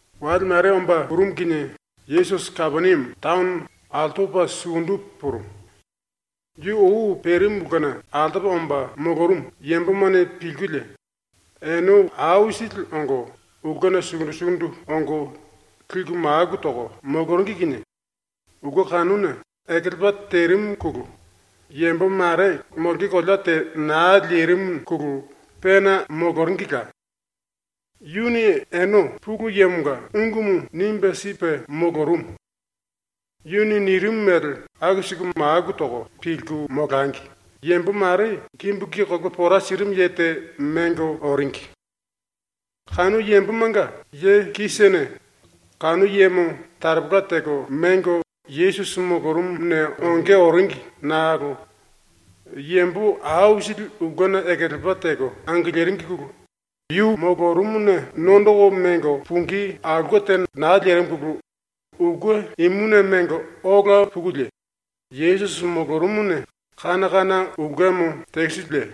Wale mare omba purumu kinie Yesusi Kapeniame taono altopa sukundu purumu. Yu ou perimu ulkena altopa omba molorumu yambomane pilkulie ene aisili ongo ulkena sukundu sukundu ongo liku maku toko moloringi kinie ulke kanuna ekelepa terimuna yambo mare molonge kolea te naa lerimuna pena moloringila. Yuni ene ⸤Pulu Yemonga⸥ ungumu nimbe sipe molorumu. ⸤Yuni nirimu mele aku siku maku toko pilku molangi⸥ yambo mare kimbu ki kolopa pora sirimu ye te mengo oringi. Kanu yambomanga ye kisene kanu yemo taropola teko mengo Yesusi molorumuna onge oringi nakolo yambo aisili ulkena ekelepa teko angiliringine yu molorumuna nondoko mengo pungí aulke te naa lerimuna ulke imuna mengo ola pukulie Yesusi molorumuna kana kana ulkemo tekisikulie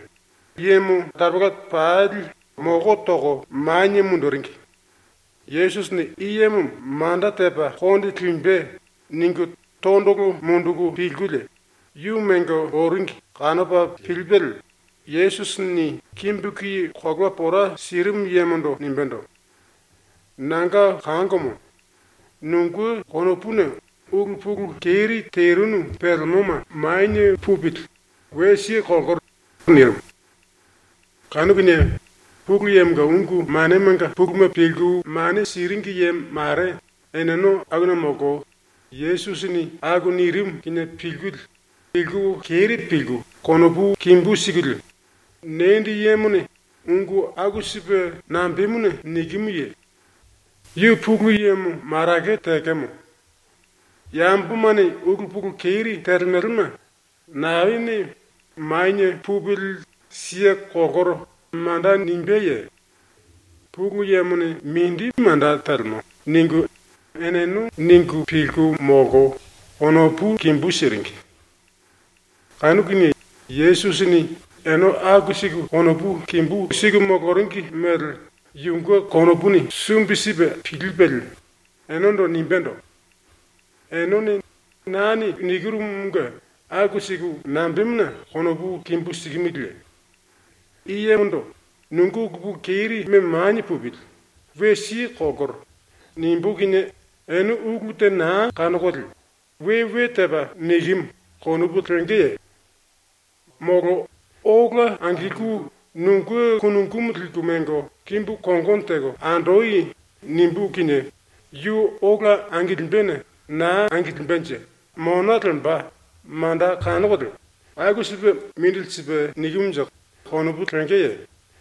yemo taropola pali moko toko manie munduringi. ⸤‘Yesusini i yemo manda tepa konde limbe.’ ningu⸥ tondolo munduku pilkulie yu mengo oringi kanopa pilipelie Yesusini kimbu ki kolopa pora sirimu yemondo nimbendo: “Nanga kangomo, nunge konopuna ulu pulu keri terinu pelemoma manie pupili, we siye kolkoro.” nirimu. ⸤Kanu kinie,⸥ Pulu Yemonga ungu manemanga puluma pilku mane siringi ye mare eneno akuna molko ⸤Yesusini aku nirimu kinie pilkulie pilku keri pilku⸥ konopu kimbu sikulie, “Nendi yemone ungu aku sipe nambemuna nikimuye? Yu Pulu Yemo marake tekemo. Yambomane ulu pulu keri telemelema naene ‘Manie pupili, siye kolkoro.’ manda nimbeye? Pulu Yemone mindi manda telemo.” ningu eneno ningu pilku molko konopu kimbú siringi. Kanu kinie Yesusini ene aku siku konopu kimbú siku moloringi mele yunge konopuni sumbi sipe pilipelie enendo nimbendo: “Enene ⸤nane nikirumunge⸥ aku siku nambemuna konopu kimbú sikimiliye? I yemondo “Nunge ulu pulu kerime manie pupili, we siye kolkoro.” nimbú kinie ene ulu te naa kanokolie ‘We we tepa nikimu.’ konopu lengeye? Molo “Ola angilku nunge kunungumu liku mengo kimbu kongono teko andoi.” nimbú kinie yu ola angilimbene naa angilimbenje mona lemba manda kanokolie ‘Aku sipe mindili sipe nikimunje.’ konopu lengeye?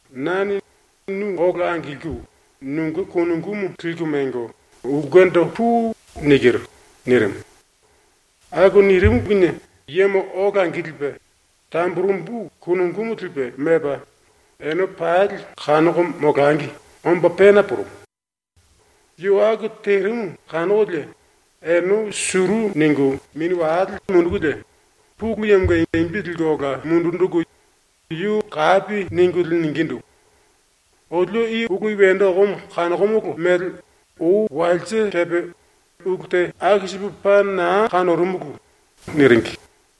“Nane ‘Nu ola angilku nunge kunungumu liku mengo ulkendo pui.’ nikiru.” nirimu. Aku nirimu kinie yemo ola angilipe tamburembu kunungumu lipe memba, ene pali kanoko molangi omba pena purumu. Yu aku terimu kanokolie ene suru ningu mini wale mundukulie Pulu Yemonga imbi ambolko ola linjiku yu kapi ningulie ningindu: “Olio i ulu wendo okomo kanokomolo mele ou walse kepe ulu te aku sipu paa naa kanorumulu.” niringi.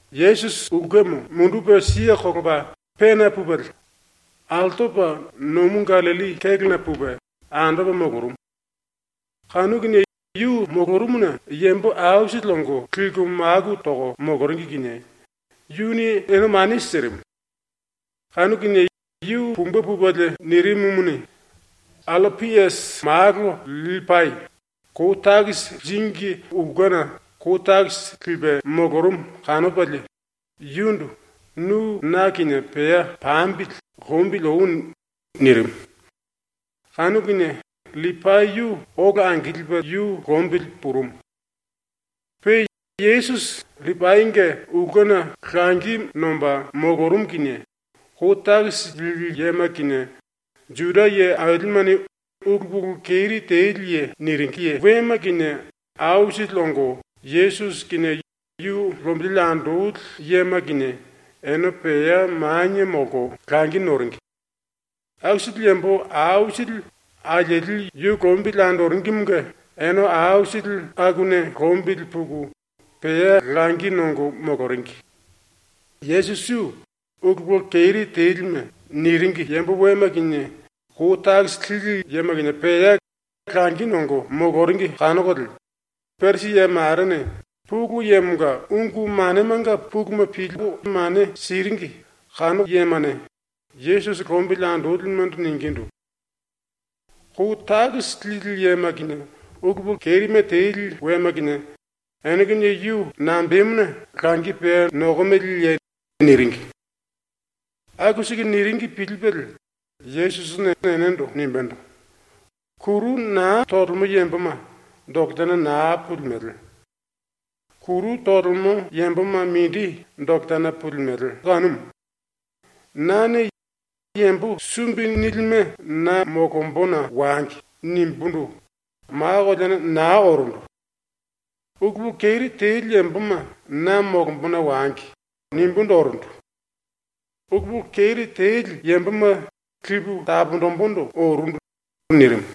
Yesusi ⸤ulkemo mundupe kelepa⸥ pena pupelie altopa nomu Gallilli kélona pupe andopa molorumu. Kanu kinie yu molorumuna yambo aisili ongo liku maku toko moloringi kinie yuni ene mane sirimu. Kanu kinie yu pumbe pupelie nirimumuni, Allapiasi malo LLipai kou takisi liringi ulkena ⸤kou takisi lipe⸥ molorumu kanopalie yundu “Nu na kinie pea pambili lombili oi.” nirimu. Kanu kinie LLipai yu ola angilipe yu lombili purumu. Pe Yesusi LLipainge ulkena langi nomba molorumu kinie kou takisi lili yema kinie, ⸤Juda ye ailimene⸥ “ulu pulu keri teli ye” ⸤niringi⸥ wema kinie aisili ongo Yesusi kinie yu lombili andoli yema kinie ene pea manie molko langi noringi. Aku sili yambo aisili alieli yu lombili andoringimunge ene aisili ⸤akuna lombili puku⸥ pea langi nongo moloringi. Yesusi yu “ulu pulu keri telime” niringi yambo wema kinie kou takisi lili yema kinie pea langi nongo moloringi kanokolie Parisi ye marene, Pulu Yemonga ungu manemanga puluma pilku mane siringi kanu yemane, Yesusi lombili andolimendo ningindu: “Kou takisi lili yema kinie, ulu pulu kerime teli wema kinie, ene kinie yu nambemuna langi pea nokomeleye?” niringi. Aku siku niringi pilipelie Yesusini enendo nimbendo: “Kuru naa tolemo yamboma doketana naa pulimele. Kuru tolemo yamboma mindi doketana pulimele kanumu. Nane “Yambo sumbi nilime na molombona wangi.” nimbundu ma koleana naa orundu. ‘Ulu pulu keri teli yamboma na molombona wangi.’ nimbundu orundu. Ulu pulu keri teli yamboma lipu taponjimbundu orundu.” nirimu.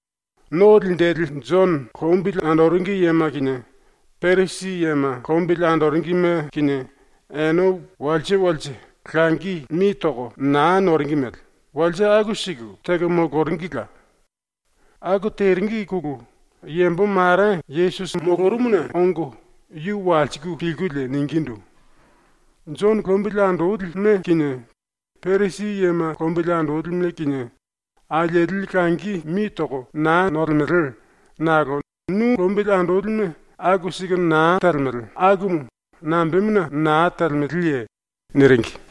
No Linjili Jono lombili andoringi yema kinie, Parisi yema lombili andoringime kinie, ene walse walse langi mi toko naa noringi mele walse aku siku teko moloringila. ⸤Aku teringine⸥ yambo mare Yesusi molorumuna ongo yu walsiku pilkulie ningindu: “Jono lombili andolime kinie, Parisi yema lombili andolime kinie, alieli langi mi toko naa nolemele nakolo nu lombili andolime aku siku naa telemele akumu nambemuna naa telemeleye?” niringi.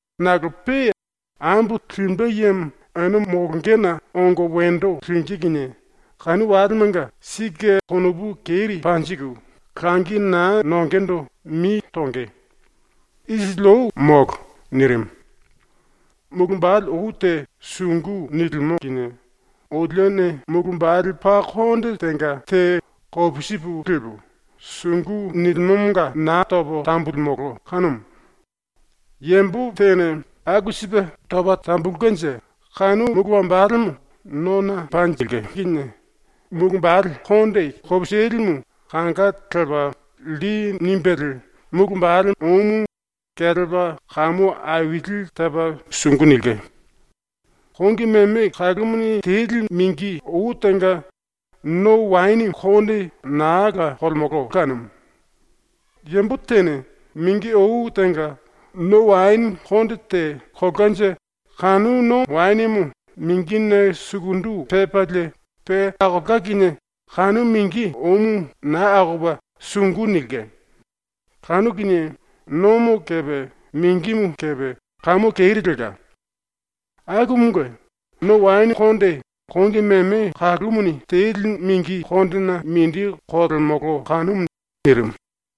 Nakolo pe, ambo limbe yemo ene molongena ongo wendo lingí kinie kanu walemanga sike ⸤konopu keri panjiku⸥ langi naa nongendo mi tonge. ⸤Isili ou molo.⸥” ⸤nirimu.⸥ “Mulu wambale ou te sungu nilimo kinie olione mulu wambale paa konde tenga te kopisipu lipu, sungu nilimomonga naa topo tambululimolo kanumu. Yambo tene aku sipe topa tambulkenje kanu mulu wambalemo nona panjilke kinie mulu wambale konde kopisilimu kanga lepa lli nimbelie mulu wambale oumu kelepa kamu aili tepa sungu nilke. Kongi meme kalumuni teli mingi ou tenga no waene konde naa la kolemolo kanumu. Yambo tene mingi ou tenga no waene konde te kolkanje kanu no waenemo mingine sukundu pepalie pe akolka kinie kanu mingi oumu naa akopa sungu nilke. Kanu kinie nomo kepe mingimu kepe kamu keri lelka. Akumunge no waene konde kongi meme kalumuni teli mingi kondena mindi kolemolo kanumu.” nirimu.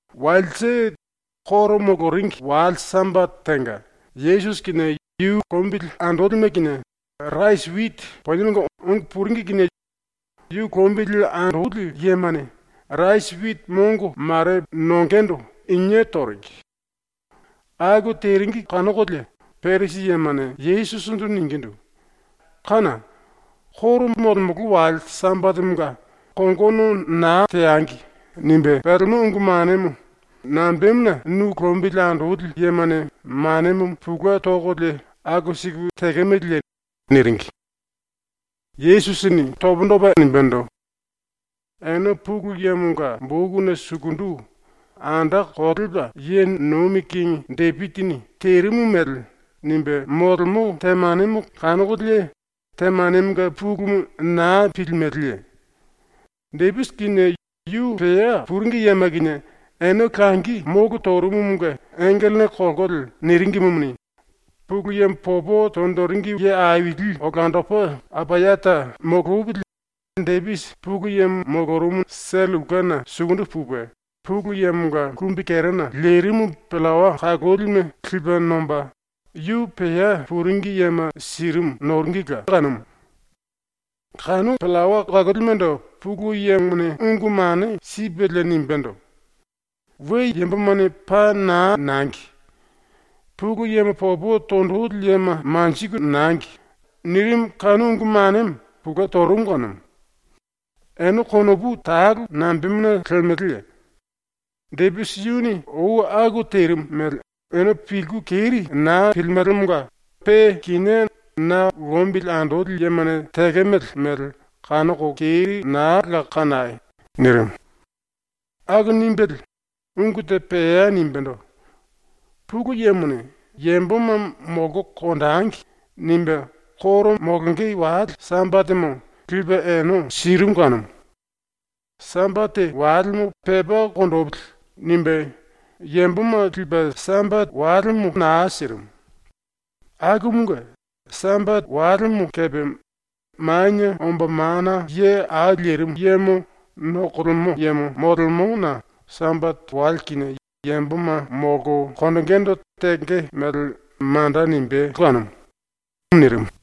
Walse, ⸤Juda yambomanga koro moloringi⸥ wale Sambate tenga, Yesusi kinie yu lombili andolime kinie rasi witi poniemanga ongo puringi kinie yu lombili andoli yemane rasi witi mongo mare ⸤nongendo⸥ inie toringi. Aku teringi kanokolie Parisi yemane Yesusindu ningindu: “Kána! ⸤Koro molemolo⸥ wale Sambatemonga ‘Kongono naa teangi.’ nimbe pelemo ungu manemo nambemuna nu lombili andoli yemane manemo pulue tokolie aku siku tekemeleye?” niringi. Yesusini pundu topa nimbendo: “Ene Pulu Yemonga bokuna sukundu ⸤anda kolepa ye nomi kingi⸥ Depisini terimu mele nimbe molemo temanemo kanokolie ⸤temanemonga pulumu⸥ naa pilimeleye? Depisi kinie yu pea puringi yema kinie ene ⸤langi⸥ molo torumu⸤munge⸥ engelene kolkolie niringimuni, Pulu Yemo popo tonjiringi ye aili olandopa Apayata molopili Depisi Pulu Yemo molorumu sele ulkena sukundu pupe, Pulu Yemonga kumbikerena lerimu pillawa kalolime lipe nomba, yu pea puringi yema sirimu noringila kanumu. Kanu pillawa kalolimendo Pulu Yemone ungu mane sipelie nimbendo: “We yambomane paa naa nangi! Pulu Yemo popo tonjili yema manjiku nangi!” nirimu ⸤kanu ungu manemo pulue torumu⸥ kanumu. ⸤Ene konopu talo nambemuna lemeleye? Depisi yuni ou aku terimu mele ene pilku keri naa pilimelemonga pe kinié na lombili andoli yemane tekemele mele kanoko keri naa la kanai!⸥” nirimu. Aku nimbelie ungu te pea nimbendo: “Pulu Yemone ‘Yamboma molko konjengi.’ nimbe koro molonge wale Sambatemo lipe ene sirimu kanumu. ‘Sambate walemo pepa konjipili.’ nimbe yamboma lipe Sambate walemo naa sirimu. Akumunge Sambate walemo kepe Manie Omba Mana Ye Au Lerimu Yemo nokolemo yemo molemona ⸤Sambate wale kinie yamboma molko konjingindu tenge mele manda nimbé kanumu⸥.” nirimu.